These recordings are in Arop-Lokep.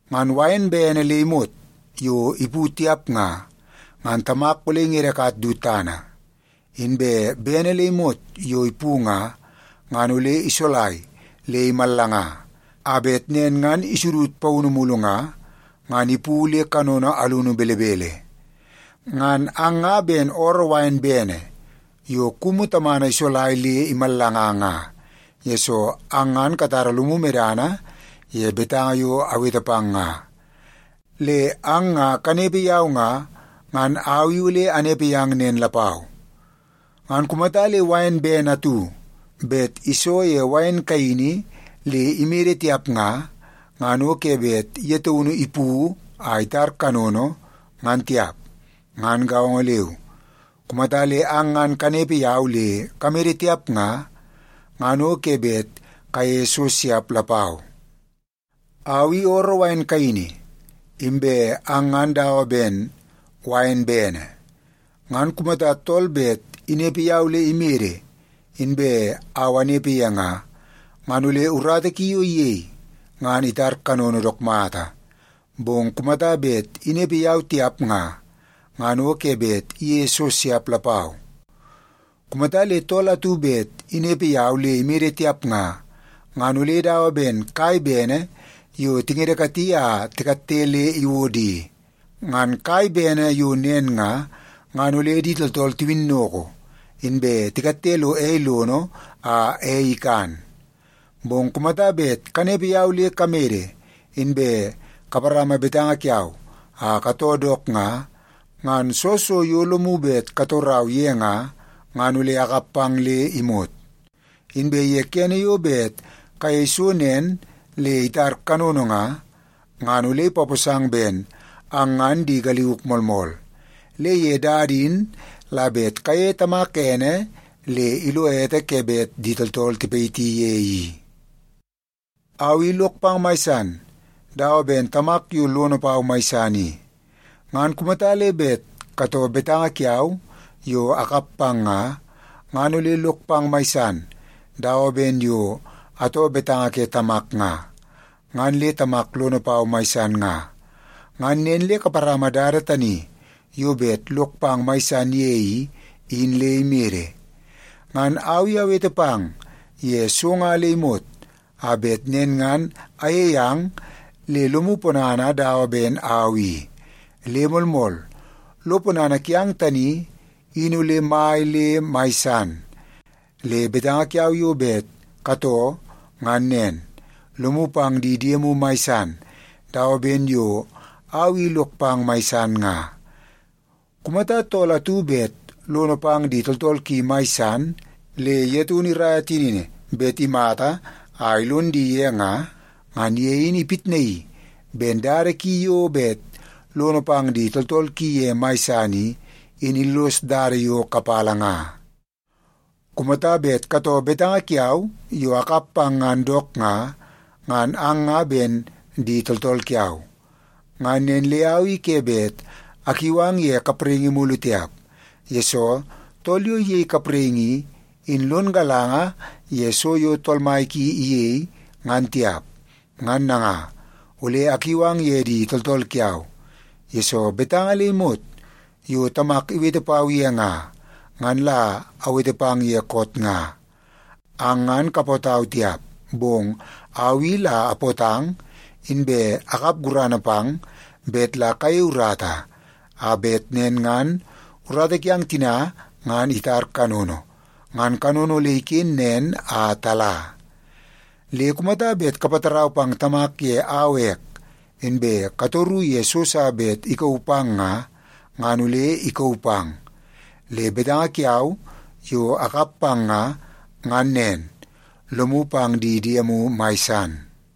Ngan wain bene le imot yo ipu tiap nga, ngan Tamak ole ingedekat du tana. Inbe bene le imot yo ipu nga, ngan ole isolai le imallanga, a bet nen ngan isudud paunu mulu nga, ngan ipu le kanono alunu belebele. Ngan ang nga ben ooroo wain bene yo kumu tamana isolai le imallanga nga, yesoo ang ngan katara lomu medana ye betanga yo awete pang nga. Le ang nga kanepe yau nga, ngan au i ole anepe yang nen lapau. Ngan kumata le wain bene atu bet iso ye wain kaini le imede tiap nga, ngan o ke bet ye taunu ipu a itar kanono, ngan tiap. Ngan gaongo leu, kumata le ang ngan kanepe yau le kamede tiap nga, ngan o ke bet kayeie so siap lapau. “Au i ooroo wain kaini, inbe ang ngan dawa ben wain bene. Ngan kumata tool bet inepe yau le imede inbe au anepe ye nga, ngan ole urata ki yo iyei, ngan itar kanono dook mata. Bong kumata bet inepe yau tiap nga, ngan o ke bet iyeie so siap lapau. Kumata le tool atu bet inepe yau le imede tiap nga, ngan ole dawa ben kai bene yo tingedekati a tikatte le iwod i. Ngan kai bene yo nen nga, ngan ole di tooltool tiwinnoko, inbe tikatte lo ei lono a ei ikan. Bong kumata bet kanepe yau le kamede, inbe kaparama betanga kiau a katoo dook nga, ngan soo so yo lomu bet katorau ye nga, ngan ole akap pang le imot. Inbe ye kene yo bet kayei so nen le itar kanono nga, ngan ole ipaposang ben ang ngan di galiuk moolmool. Le ye dada in la bet kayeie Tamak ene le ilo ete ke bet di tooltool tipayiti ye i. “Au i lok pang mai san, dawa ben Tamak yo lono pau mai san i. Ngan kumata le bet katoo betanga kiau yo akap pang nga, ngan ole lok pang mai san, dawa ben yo atoo betanga ke Tamak nga, ngan le Tamak lono pau mai san nga. Ngan nen le kaparama dada tani yo bet lok pang mai san ye i, in le imede. “Ngan au i awete pang ye so nga le imot, a bet nen ngan ayeie ang le lomu ponana dawa ben au i. Le moolmool, lo ponana kiang tani in ole mai le mai san. Le betanga kiau yo bet katoo ngan nen: Lomu pang di diemu mai san, dawa ben yo au i lok pang mai san nga. Kumata tool atu bet lono pang di tooltool ki mai san, le ye taunu iraia tinini bet imata a ilon di ye nga, ngan ye in ipitnaii ben dada ki yo bet lono pang di tooltool ki ye mai san i, in illos dada yo kapala nga. “Kumata bet katoo betanga kiau yo akap pang ngan dook nga, ngan ang nga ben di tooltool kiau. Ngan nen le au i ke bet akiu ang ye kapraingi mulu tiap, yesoo tool yo iyei kapraingi i, in lon galanga ye so yo tool mai ki iyei, ngan tiap. Ngan nanga, ole akiu ang ye di tooltool kiau, yesoo betanga le imot yo Tamak iwete pau ye nga, ngan la awete pang ye koot nga. Ang ngan kapootau tiap, bong au i la apootang, inbe akap gurana pang bet la kayei urata, a bet nen ngan urata kiang tina ngan itar kanono, ngan kanono ole iken nen a tala. Le kumata bet kapatarau pang Tamak ye au ek, inbe katoru ye so sa bet ikauu pang nga, ngan ole ikauu pang. Le betanga kiau yo akap pang nga, ngan nen: Lomu pang di diemu mai san.”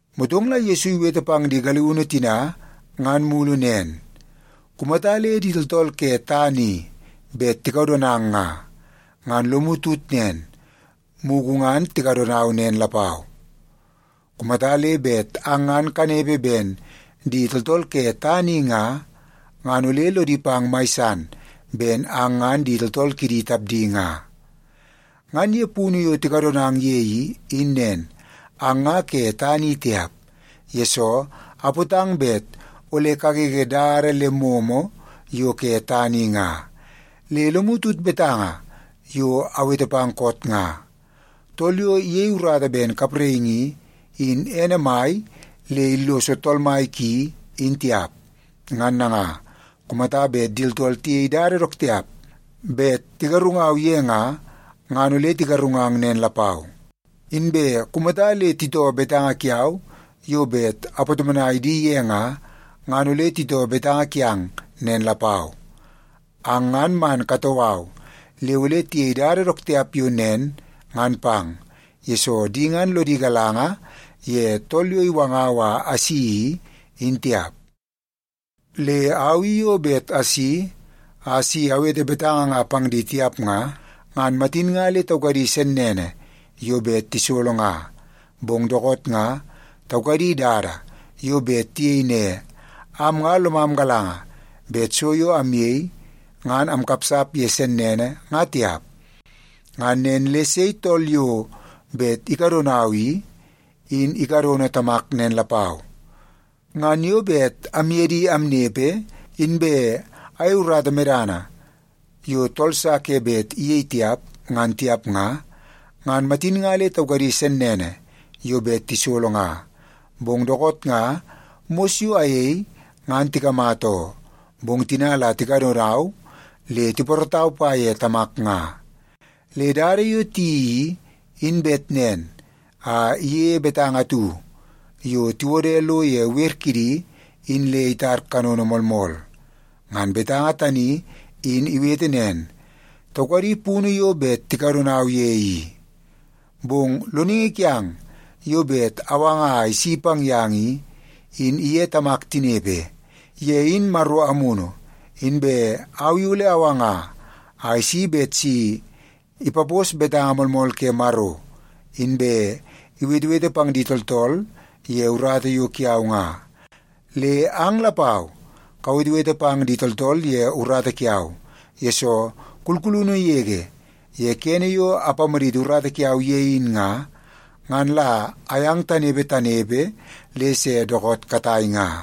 Motong la Yesu iwete pang di galiunu tina ngan mulu nen, “Kumata le di tooltool ke tana i bet tikadonang nga, ngan lomu tut nen, mugu ngan tikadonau nen lapau. Kumata le bet ang ngan kanepe ben di tooltool ke tana i nga, ngan ole lodi pang mai san ben ang ngan di tooltool kidi tapdi nga. Ngan ye punu yo tikadonang ye i, in nen, ang nga ke tana i tiap, yesoo apootang bet ole kagege dada le momo yo ke tana i nga. Le lomu tut betanga yo awete pang koot nga: ‘Tool yo iyei urata ben kapraingi i, in ene mai le illoso tool mai ki, in tiap.’ Ngan nanga, kumata bet di tooltool tiyei dada dook tiap bet tigarungau ye nga, ngan ole tigarungang nen lapau. Inbe kumata le titoo betanga kiau yo bet apatomonai di ye nga, ngan ole titoo betanga kiang nen lapau. Ang ngan man katoo au le ole tiyei dada dook tiap yo nen ngan pang, yesoo di ngan lodi galanga ye Tool yo iwangau a asi i, in tiap. Le au i yo bet asi a si awete betanga nga pang di tiap nga, ngan matin nga le taukadi sennene yo bet tisolo nga. Bong dookoot nga, taukadi dada yo bet tiyei ne, ‘Am nga lomam galanga bet so yo amyei, ngan amkapsap ye sennene, nga tiap.’ Ngan nen le sei tool yo bet ikadonau i, in ikadono Tamak nen lapau. Ngan yo bet amye di amnepe inbe ayei urata medana yo tool sa ke bet iyei tiap, ngan tiap nga, ngan matin nga le taukadi sennene yo bet tisolo nga. Bong dookoot nga mos yo ayei ngan tikamata oo, bong tina la tikadonau le tipoorootau pa ye Tamak nga. Le dada yo tiyeii i, in bet nen a iyeie betanga atu yo tiwode lo ye wer kidi in le itar kanono moolmool. Ngan betanga tani in iwete nen, ‘Taukadi punu yo bet tikadonau ye i.’ “Bong Loningi kiang yo bet awanga a isi pang yang i, in iye Tamak tinepe. Ye in Maro Amunu, inbe au i ole awanga a isi bet si ipapos betanga moolmool ke Maro, inbe iwetewete pang di tooltool ye urata yo kiau nga. Le ang lapau kawetewete pang di tooltool ye urata kiau, yesoo kulkulunu yege ye kene yo apamaditi urata kiau ye in nga, ngan la ayang tanepe tanepe le se dookoot katai nga.”